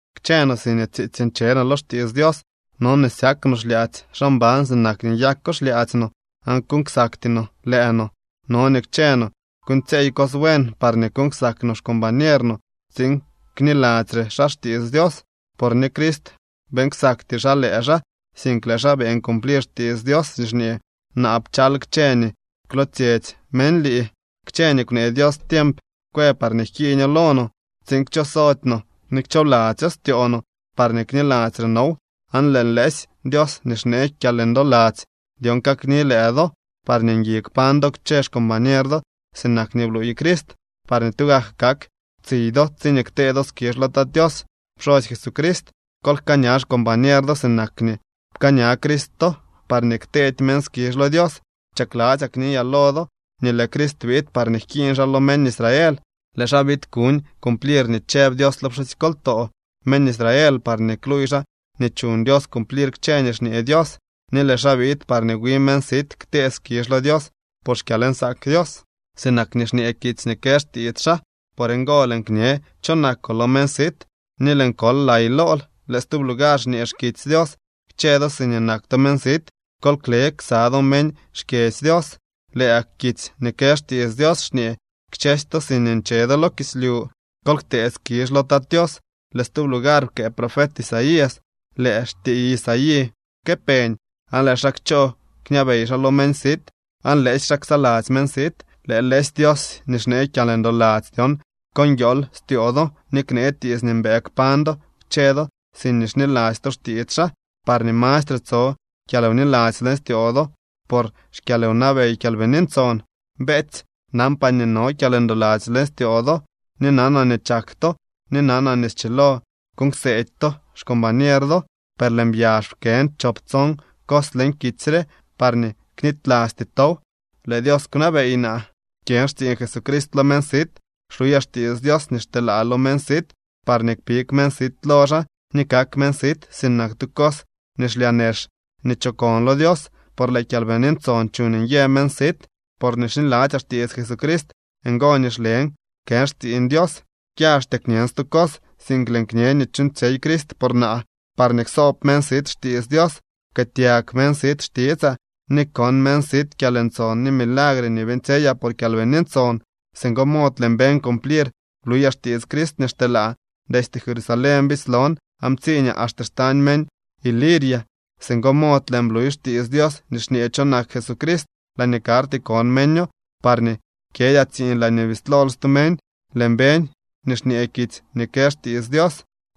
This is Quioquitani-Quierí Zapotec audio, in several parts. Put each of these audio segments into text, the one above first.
Kchë no siñee tsiitsy nche no lo xtiits Dios, no nii syak no xlyaadzy xaa mban sinak nii nyako xlyaadzy no aan kuuñ ksakty no lëë no. No nii kchë no kuuñtsyeey cos buen parñee kuuñ ksak no xcombañer no tsiin kniladzyre xaa xtiits Dios. Por ni Crist beeñ ksakty xaa lëë xaa, sink lëë xaa beeñ cumplir xtiits Dios nii xñee: “Naa pchal kchë nii kwlootsyetsy meñ lii.” Kchë nii kwnee Dios tiemp kwë parñee jkiiño lo no tsiin kchosody no ni kchoobladzyo styoo no parñee kniladzyre now. Aan lëë lëësy Dios nii xnee kyalndoladzy dyon kakni lëë do parñee ngui kpañ do kchë xcombañer do sinak nii bluuy Crist parñee tugak kak tsiy do tsiñee ktee do skizh lo Tat Tios pxosy Jesucrist. Kol jkaaña xcombañer do sinak nii pkaaña Crist to parñee kteedy meñ skizh lo Dios. Chakladzyaa kniyaa lo do nii lëë Crist biid parñee jkiiñ xaa lo meñ Israel. Lëë xaa biid kuñ cumplir nii chëb Dios lo pxusykoltoo meñ Israel parñee kluuy xaa nii chuñ Dios cumplir kchë nii xñee Dios. Ni lëë xaa biid parñee wi meñ sit ktee skizh lo Dios por xkyalnsaak Dios, sinak nii xñee kitsy nii kë xtiits xaa: Por ngo lëën kñe cho nakoo lo meñ sit, ni lëën kol lay lool. Lëë stub lugar xñee xkitsy Dios: Kchë do siñee nak to meñ sit, kol kle ksa do meñ xkyedzy Dios. Lëë gak kitsy nii kë xtiits Dios xñee: Kchësy to siñee nche do lo kislyu, kol ktee skizh lo Tat Tios. Lëë stub lugar pkëë profet Isaías: Lëë xtiiy Isaí jkëpeñ, aan lëë xaa kchoo kñabey xaa lo meñ sit, aan lëësy xaa ksaladzy meñ sit. Lëë lëësy Dios nii xnee kyalndoladzy dyon, ko nguiool styoo do ni knee tiits nii mbëë kpañ do kchë do siñee xniladzy to xtiits xaa, parñee mastre tso kyalwniladzy leñ styoo do por xkyalwnabey Kyalbini Ntson. Beetsy, nanpaa nii no kyalndoladzy leñ styoo do, ni nanaa nii chak to, ni nanaa nii schilo kuuñ kseedy to xcombañer do, per lëën byax pkën chop tson cos leñ kitsy re, parñee knitylasty tow. Lëë Dios kwnabey naa. Kyën xtsiiñ Jesucrist lo meñ sit. Xluyaa xtiits Dios nii xteelaa lo meñ sit, parñee kpig meñ sit lo xaa, ni kak meñ sit sinak tu cos nii xlyaa nex nii chokon lo Dios. Por lëë Kyalbini Ntson chuuñ nyë meñ sit. Porñee xniladzyaa xtiits Jesucrist, ngo nii xlen kën xtsiiñ Dios. Kyaxtyaa kñën stu cos, sink lëën kñe nii chuuñtsyey Crist por naa, parñee ksoob meñ sit xtiits Dios. Pkëëtyag meñ sit xtitsaa ni kon meñ sit kyalntson ni milagre nii beeñtsyeyaa por Kyalbini Ntson. Singo mod lëën beñ cumplir bluyaa xtiits Crist nii xteelaa. Destye Jerusalén bislon aan ptsiiñaa axte xtañ meñ Iliria. Singo mod lëën bluy xtiits Dios nii xñee cho nak Jesucrist laañee karty kon meño, parñee kyëdyaa tsiiñ laañee bislol stu meñ. Lëën beñ nii xñee kitsy nii kë xtiits Dios: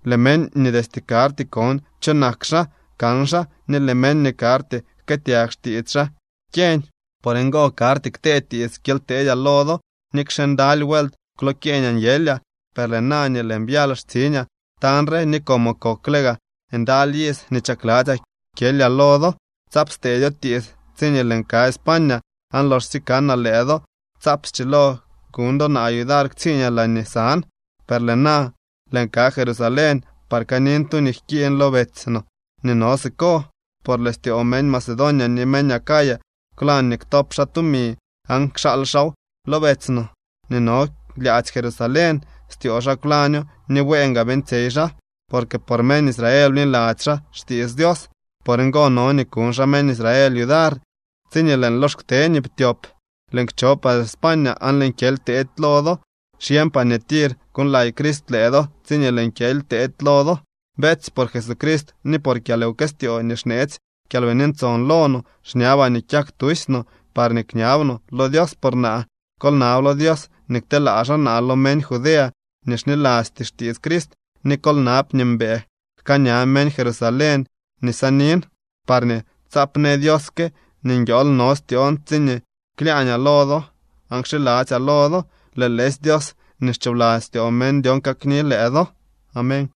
Lëë meñ nii destye karty kon cho nak xaa kan xaa, ni lëë meñ nii karty jkëëtyag xtiits xaa kyeñ. Por ngo karty ktee tiits kyely teedyaa lo do, nikxe ndaly vuelt kwlokyeeñaa nyelyaa. Per lëë na nii lëën byal xtsiñaa tañ re, ni como kokle gaa ndaly iz nii chakladzyaa kyelyaa lo do, tsaap steedyo tiits tsiñee lëën ka España. Aan loxsye kanaa lëë do, tsaap schilo kuñ do naa yudar ktsiiñaa laañee san. Per lëë na lëën ka Jerusalén par kanin tu nii jkiiñ lo betsy no nii no siko. Por lëë styoo meñ Macedonia ni meñ Acaya kwlañ nii ktop xaa tumi aan kxaal xaaw lo betsy no nii no lyaadzy Jerusalén. Styoo xaa kwlaño ni bueen gaa beeñtsyey xaa, porque por meñ Israel bniladzy xaa xtiits Dios. Por ngo no nii kuñ xaa meñ Israel yudar. Tsiñee lëën lox kte nii ptyop, lëën kcho par España aan lëën kyely teedy lo do. Xyeñpaa nii tir kuuñlay Crist lëë do tsiñee lëën kyely teedy lo do. Beetsy, por Jesucrist ni por kyalwkëstyoo nii xneetsy Kyalbini Ntson lo no, xñabaa nii kyak tusy no, parñee kñab no lo Dios por naa. Kol nab lo Dios nii kteelaa xaa naa lo meñ Judea nii xnilasty xtiits Crist, ni kol nab nii mbëë jkaaña meñ Jerusalén nii sanin, parñee tsaap në Dios que nii nguiool no styoon tsiñee klyaañaa lo do aan kxiladzyaa lo do. Lëë lëësy Dios nii xchoobladzy styoo meñ dyon kakni lëë do. Amén.